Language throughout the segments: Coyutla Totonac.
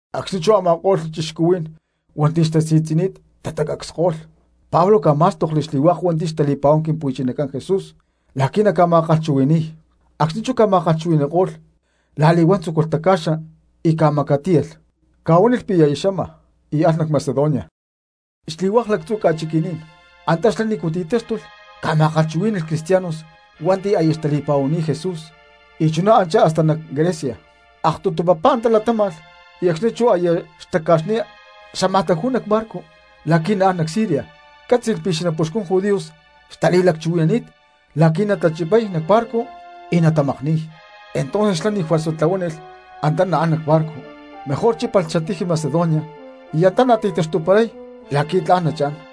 Acxni̠ chú a̠ma̠ko̠lh cristianos hua̠nti̠ xtasi̠tzi̠ni̠t tatacacsko̠lh, Pablo ca̠má̠stokli xli̠hua̠k hua̠nti̠ xtali̠pa̠huán Quimpu̠chinacán Jesús la̠qui̠ naca̠ma̠kalhchuhui̠ni̠y, acxni̠ chú ca̠ma̠kalhchuhui̠ni̠ko̠lh la̠li̠huán tzúculh taca̠xa y ca̠macatíyalh, ca̠huánilh pi̠ aya xama, y alh nac Macedonia. Xli̠hua̠k lactzu̠ ca̠chiqui̠ní̠n antanícu xlá ti̠táxtulh ca̠ma̠kalhchuhuí̠ni̠lh cristianos hua̠nti̠ aya xtali̠pa̠huani̠t Jesús y chuná anchá hasta nac Grecia. Aktutu papá antá latáma̠lh y acxni̠ chú aya xtaca̠xni̠t, xámaj taju̠y nac barco la̠qui̠ naán nac Siria, cátzi̠lh pi̠ xanapuxcun judíos xtali̠lacchuhui̠nani̠t la̠qui̠ natachipay nac barco y natamakni̠y. Entonces xlá ni̠ juerza tlahuánilh antá napu̠án nac barco mejor chípalh xatiji Macedonia y antá nati̠taxtuparay la̠qui̠ tla̠n nachá̠n.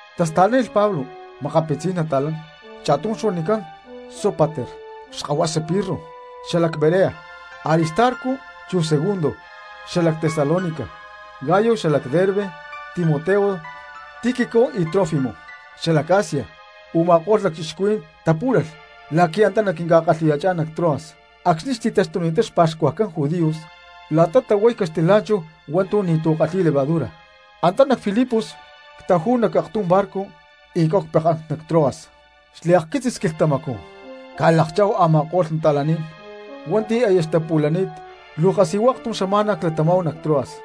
Tasta̠lánilh Pablo makapitzí̠n nata̠lán, cha̠tum xuanicán Sópater xkahuasa Pirro xalac Berea, Aristarco chu Segundo xalac Tesalónica, Gayo xalac Derbe, Timoteo, Tíquico y Trófimo xalac Asia. Uma̠kó̠lh lacchixcuhuí̠n tapú̠lalh la̠qui̠ antá naquinca̠kalhi̠ya̠chá̠n nac Troas. Acxni̠ xti̠taxtuni̠ttá xpa̠xcuajcán judíos la̠ta tahuay caxtilá̠nchahu hua̠ntu̠ ni̠tu̠ kalhi̠y levadura, antá nac Filipos ctajú̠hu nac aktum barco y cáhu pekán nac Troas, xliakquitzis quilhtamacú cca̠lakchá̠hu a̠ma̠ko̠lh cristianos hua̠nti̠ aya xtapu̠lani̠t, luu kasijua aktum xama̠na clatamá̠hu nac Troas.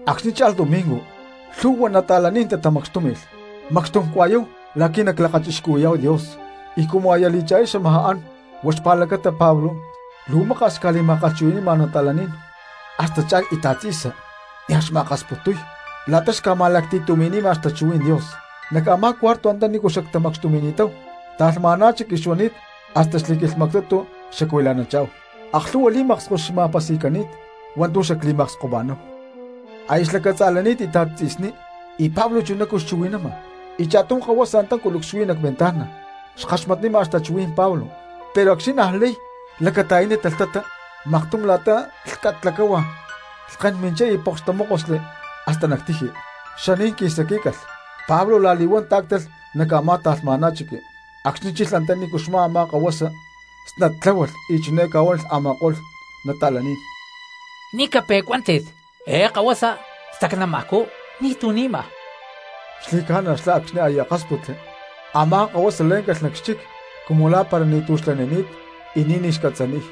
Acxni̠ cha̠lh domingo lhu̠hua cristianos tatamacxtúmi̠lh, macxtum cua̠yáhu la̠qui̠ naclakachixcuhui̠yá̠hu Dios, y cumu aya li̠cha̠lí xamajá an huá xpa̠lacata Pablo luu maka̠s xca̠li̠ma̠kalhchuhui̠ni̠ma cristianos, hasta cha̠lh íta̠t tzi̠sa nia̠ xma̠akasputuy la̠ta xca̠ma̠lacti̠tumi̠nima xtachuhuí̠n Dios. Nac a̠má cuarto antanícu xactamacxtumi̠ni̠táhu ta̠lhma̠ná chiqui xuani̠t y hasta xli̠quilhmactutu xacuila̠nanchá̠hu, aklhu̠hua li̠maksko xca̠ma̠pasi̠cani̠t hua̠ntu̠ xacli̠makskoma̠náhu. Aya xlacatza̠lani̠t íta̠t tzi̠sní y Pablo chunacú xchuhui̠nama, y cha̠tum kahuasa antá culucs xuí nac ventana xkaxmatnima xtachuhuí̠n Pablo, pero acxni̠ niaj lay lacata̠yánilh talhtata maktum la̠ta lhcat lacáhua, lhken minchá y poks tamókosli hasta nac tiji, xaní̠n qui̠saquí̠calh. Pablo la̠li̠huán tá̠ctalh nac a̠má ta̠lhma̠ná chiqui, acxni̠ chilh antaní xmá a̠má kahuasa, snat tláhualh y chiné ca̠huánilh a̠ma̠ko̠lh cristianos: —¡Ni̠ cape̠cuántit! Eé kahuasa stacnamajcú, ni̠tu̠ ni̠ma. Xli̠ca̠na xlá, acxni̠ aya akásputli a̠má kahuasa lé̠ncalh nac xchic cumu lá̠mpara ni̠tu̠ xlanini̠t y ni̠ní xcatza̠ni̠y.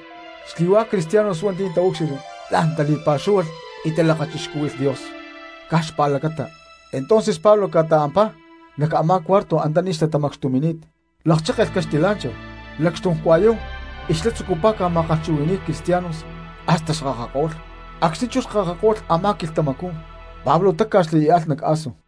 Xli̠hua̠k cristianos hua̠nti̠ taúcxilhli la̠n tali̠pa̠xúhualh y talakachixcúhui̠lh Dios caj xpa̠lacata. Entonces Pablo ca̠ta̠ampá nac a̠má cuarto antaní xtatamacxtumi̠ni̠t, lakchékelh caxtilá̠nchahu, lacxtum cua̠yáhu y xlá tzucupá ca̠ma̠kalhchuhui̠ni̠y cristianos hasta xkakako̠lh. Acxni̠ chú xkakako̠lh a̠má quilhtamacú Pablo táca̠xli y alh nac Aso.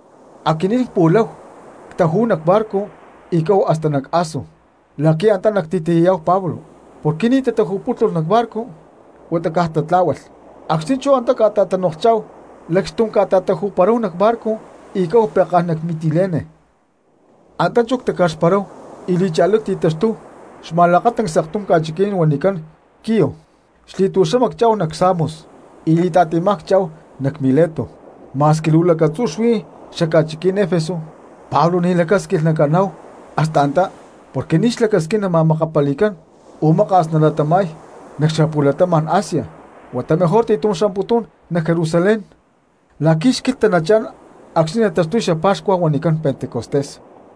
Aquinín cpu̠láhu ctajú̠hu cbarco y cáhu hasta nac Aso la̠qui̠ antá nacti̠tiyayá̠hu Pablo, porque ni̠ taju̠pútulh nac barco huata caj tla̠huáalh. Acxni̠ chú antá cta̠tanoklhchá̠hu, lacxtum ctaju̠paráhu nac barco y cáhu pekán nac Mitilene. Antá chú ctaca̠xparáhu y li̠cha̠lí cti̠taxtúhu xma̠lakatancs aktum ca̠chiquí̠n huanicán Quio, xli̠tu̠xama cchá̠hu nac Samos, y li̠ta̠ti̠má cchá̠hu nac Mileto. Ma̠squi luu lacatzú xuí xaca̠chiquí̠n Efeso Pablo ni̠ lacásquilh naccha̠ná̠hu hasta antá porque ni̠ xlacasquín nama̠makapali̠cán o maka̠s nalatama̠y nac xapu̠latama̠n Asia, huata mejor ti̠tum xcha̠mputún nac Jerusalén la̠qui̠ xquilhta nachá̠n acxni̠ taxtuy xapa̠xcua huanicán Pentecostés.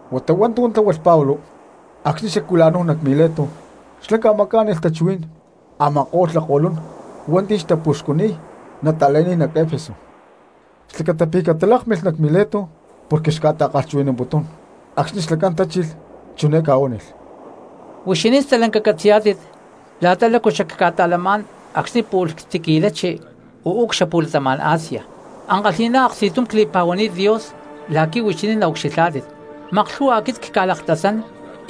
Huata hua̠ntu̠ tláhualh Pablo acxni̠ xacuila̠náhu nac Mileto, xlá ca̠macá̠nilh tachuhuí̠n a̠ma̠ko̠lh lakko̠lún hua̠nti̠ xtapuxcuniy nata̠lán nac Efeso xlacata pi̠ catalákmilh nac Mileto porque xca̠ta̠kalhchuhui̠namputún. Acxni̠ xlacán tachilh, chiné ca̠huánilh: —Huixinín stalanca catzi̠yá̠tit la̠ta lácu xacca̠ta̠lamá̠n acxni̠ pu̠lh ctiqui̠lachi uú cxapu̠latama̠n Asia. Ankalhi̠ná aksti̠tum cli̠pa̠huani̠t Dios la̠qui̠ huixinín naucxilhá̠tit, maklhu̠hua aquit cca̠laktasán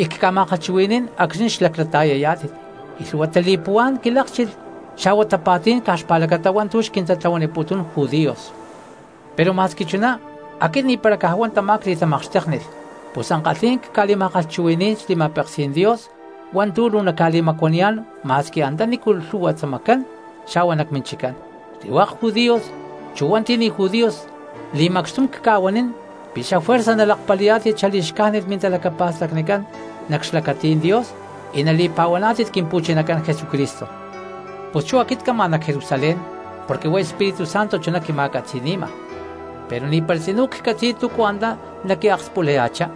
y cca̠ma̠kalhchuhui̠ní̠n acxni̠ xlaclata̠yayá̠tit, y lhu̠hua tali̠puhuá̠n quilákchilh xa̠hua tapa̠tí̠n caj xpa̠lacata hua̠ntu̠ xquintatlahuaniputún judíos. Pero ma̠squi chuná aquit ni̠para caj huá tamá cli̠tamakxtéknilh, pus ankalhí̠n cca̠li̠ma̠kalhchuhui̠ní̠n xli̠ma̠peksí̠n Dios hua̠ntu̠ luu naca̠li̠macuaniyá̠n ma̠squi antanícu lhu̠hua xtzamacán xa̠hua nac minchiccán. Xli̠hua̠k judíos chu hua̠nti̠ ni̠ judíos li̠macxtum cca̠huanín pi̠ xafuerza nalakpali̠yá̠tit xali̠xcájnit mintalacapa̠stacnicán nac xlacatí̠n Dios y nali̠pa̠huaná̠tit Quimpu̠chinacán Jesucristo. Pus chú aquit cama nac Jerusalén porque huá Espíritu Santo chuná quima̠catzi̠ni̠ma, pero ni̠para tzinú ccatzi̠y túcu antá naquiakspulaya̠chá.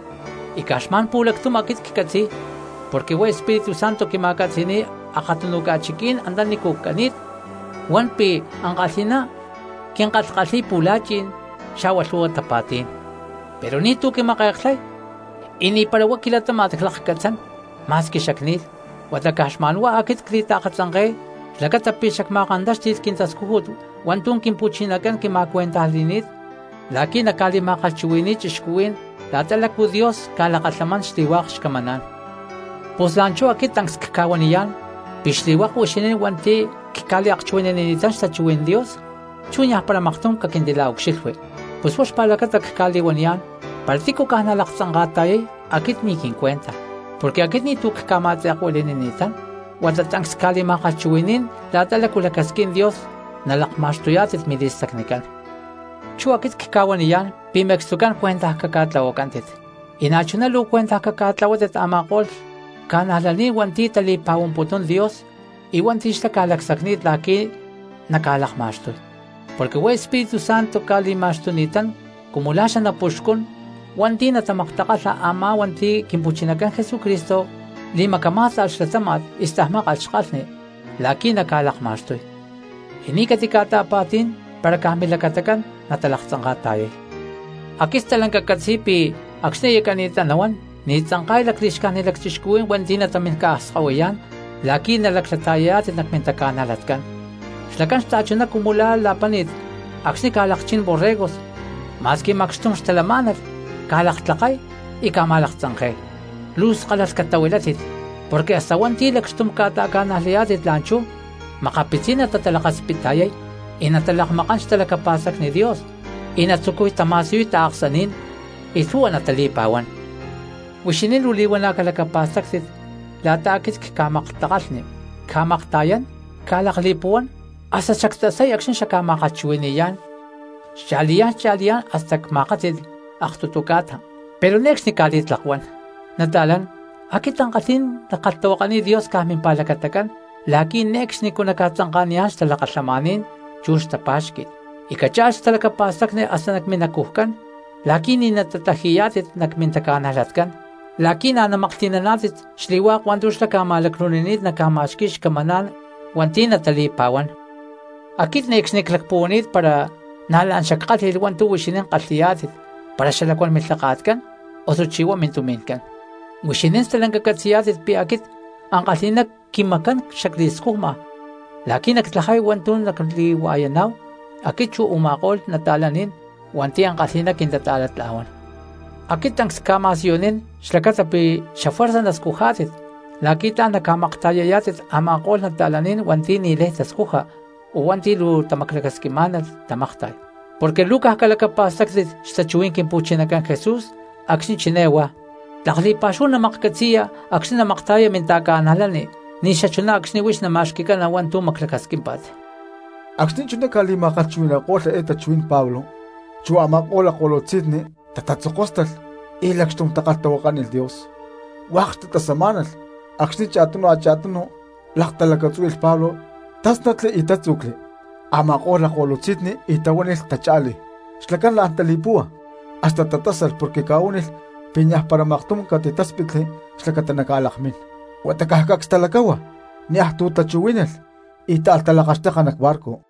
Y caj xma̠n pu̠lactum aquit ccatzi̠y, porque huá Espíritu Santo quima̠catzi̠ni̠y akatunu ca̠chiqui̠ní̠n antanícu cani̠t, huan pi̠ ankalhi̠ná quinkalhkalhi̠y pu̠la̠chi̠n xa̠hua lhu̠hua tapa̠tí̠n. Pero ni̠tu̠ quimake̠klhay, y ni̠para huá quilatáma̠t clakcatzán ma̠squi xacni̠lh, huata caj xma̠nhuá aquit cli̠taakatzanke̠y xlacata pi̠ xacma̠kantáxti̠lh quintascújut hua̠ntu̠ Quimpu̠chinacán quima̠cuentajli̠ni̠t la̠qui̠ nacca̠li̠ma̠kalhchuhui̠ni̠y cristianos la̠ta lácua Dios ca̠lakalhamán xli̠hua̠k xcamaná̠n. ’Pus la̠nchú aquit tancs cca̠huaniyá̠n pi̠ xli̠hua̠k huixinín hua̠nti̠ cca̠liakchuhui̠nanini̠tán xtachuhuí̠n Dios, chú niajpara maktum caquintila̠ucxilhui. Pus huá xpa̠lacata cca̠li̠huaniyá̠n para tícu caj nalaktzanka̠ta̠yay aquit ni̠ quincuenta, porque aquit ni̠tu̠ cca̠ma̠aktzekuili̠nini̠tán huata tancs cca̠li̠ma̠kalhchuhui̠ní̠n la̠ta lácu lacasquín Dios nalakma̠xtuyá̠tit mili̠stacnicán. Chú aquit cca̠huaniyá̠n pi̠ me̠cstucán cuentaj caca̠tlahuacántit, y na̠chuná luu cuentaj caca̠tlahuátit a̠ma̠ko̠lh cristianos hua̠nti̠ tali̠pa̠huamputún Dios y hua̠nti̠ xlá ca̠lacsacni̠t la̠qui̠ naca̠lakma̠xtuy. Porque huá Espíritu Santo ca̠li̠ma̠xtuni̠tán cumu la̠ xanapuxcún hua̠nti̠ natamaktakalha a̠má hua̠nti̠ Quimpu̠chinacán Jesús li̠macamá̠sta̠lh xlatáma̠t y stajmákalh xkalhni la̠qui̠ naca̠lakma̠xtuy, y ni̠ catica̠ta̠pa̠tí̠n para caj milacatacán natalaktzanka̠ta̠yay. Aquit stalanca ccatzi̠y pi̠ acxni̠ aya cani̠ttá nahuán ni̠ tzanka̠y lacli̠xcájnit lacchixcuhuí̠n hua̠nti̠ natamín ca̠akskahuiyá̠n la̠qui̠ nalaclata̠yayá̠tit nac mintaca̠najlatcán, xlacán xta̠chuná cumu la̠ la̠páni̠t acxni̠ ca̠lakchín borregos, ma̠squi macxtum xtalamá̠nalh ca̠laktlakay y ca̠ma̠laktzanke̠y. Luu skálalh catahuilátit porque hasta hua̠nti̠ lacxtum ca̠ta̠ca̠najlayá̠tit la̠nchú makapitzí̠n natatalakaspitta̠yay y natalakmakán xtalacapa̠stacni Dios y natatzucuy tama̠siyuy taaksaní̠n y lhu̠hua natali̠pa̠huán. Huixinín luu li̠huana̠ calacapa̠stáctit la̠ta aquit cca̠maktakalhni, cca̠makta̠yán, cca̠lakli̠puhuán, hasta xactasay acxni̠ xacca̠ma̠kalhchuhui̠ni̠yá̠n xcha̠liyá̠n xcha̠liyá̠n hasta cma̠kátzi̠lh aktutu ca̠ta, pero ne̠cxni cca̠li̠tlakuán. ’Nata̠lán, aquit ankalhí̠n nackalhtahuakaniy Dios caj mimpa̠lacatacán la̠qui̠ ne̠cxnicú naca̠tzanka̠niyá̠n xtalakalhamaní̠n chu xtapá̠xqui̠t, y cacha̠lh xtalacapa̠stacni hasta nac minacujcán la̠qui̠ ni̠ natatlaji̠yá̠tit nac mintaca̠najlatcán, la̠qui̠ na̠ naca̠maklhti̠naná̠tit xli̠hua̠k hua̠ntu̠ xlá ca̠ma̠lacnu̠nini̠t naca̠ma̠xqui̠y xcamaná̠n hua̠nti̠ natali̠pa̠huán. Aquit ne̠cxni clacpuhuani̠t para na̠ la̠n xackálhi̠lh hua̠ntu̠ huixinín kalhi̠yá̠tit para xalacuán milhaka̠tcán osuchí huá mintumi̠ncán. Huixinín stalanca catzi̠yá̠tit pi̠ aquit ankalhi̠ná quimacán xacli̠scujma la̠qui̠ nactlajay hua̠ntu̠ nacli̠hua̠yaná̠hu aquit chu u̠ma̠ko̠lh cristianos hua̠nti̠ ankalhi̠ná quintata̠latla̠huán. Aquit tancs cca̠ma̠siyunín xlacata pi̠ xafuerza nascujá̠tit la̠qui̠ tla̠n naca̠makta̠yayá̠tit a̠ma̠ko̠lh cristianos hua̠nti̠ ni̠lay tascuja o hua̠nti̠ luu tamaclacasquimá̠nalh tamakta̠y; porque luu caj calacapa̠stáctit xtachuhuí̠n Quimpu̠chinacán Jesús acxni̠ chiné huá: “Tlak li̠pa̠xúhu namaklhcatzi̠ya acxni̠ namakta̠yaya minta̠cristiano ni̠xachuná acxni̠ huix nama̠xqui̠cana hua̠ntu̠ maclacasquímpa̠t.” Acxni̠ chuná ca̠li̠ma̠kalhchuhui̠ni̠ko̠lh eé tachuhuí̠n Pablo chu a̠ma̠ko̠lh lakko̠lutzi̠nni tatatzokóstalh y lacxtum takalhtahuakánilh Dios. Hua̠k xtatasamá̠nalh acxni̠ cha̠tunu cha̠tunu laktalacatzúhui̠lh Pablo, tásnatli y tátzu̠cli a̠ma̠ko̠lh lakko̠lutzi̠nni y tahuánilh tacha̠lí. Xlacán la̠n tali̠púhua hasta tatásalh porque ca̠huánilh pi̠ niajpara maktum catitáspitli xlacata naca̠lakmín. Huata caj cacs talacáhua niaj ti̠ chuhuí̠nalh y táalh talakaxteka nac barco.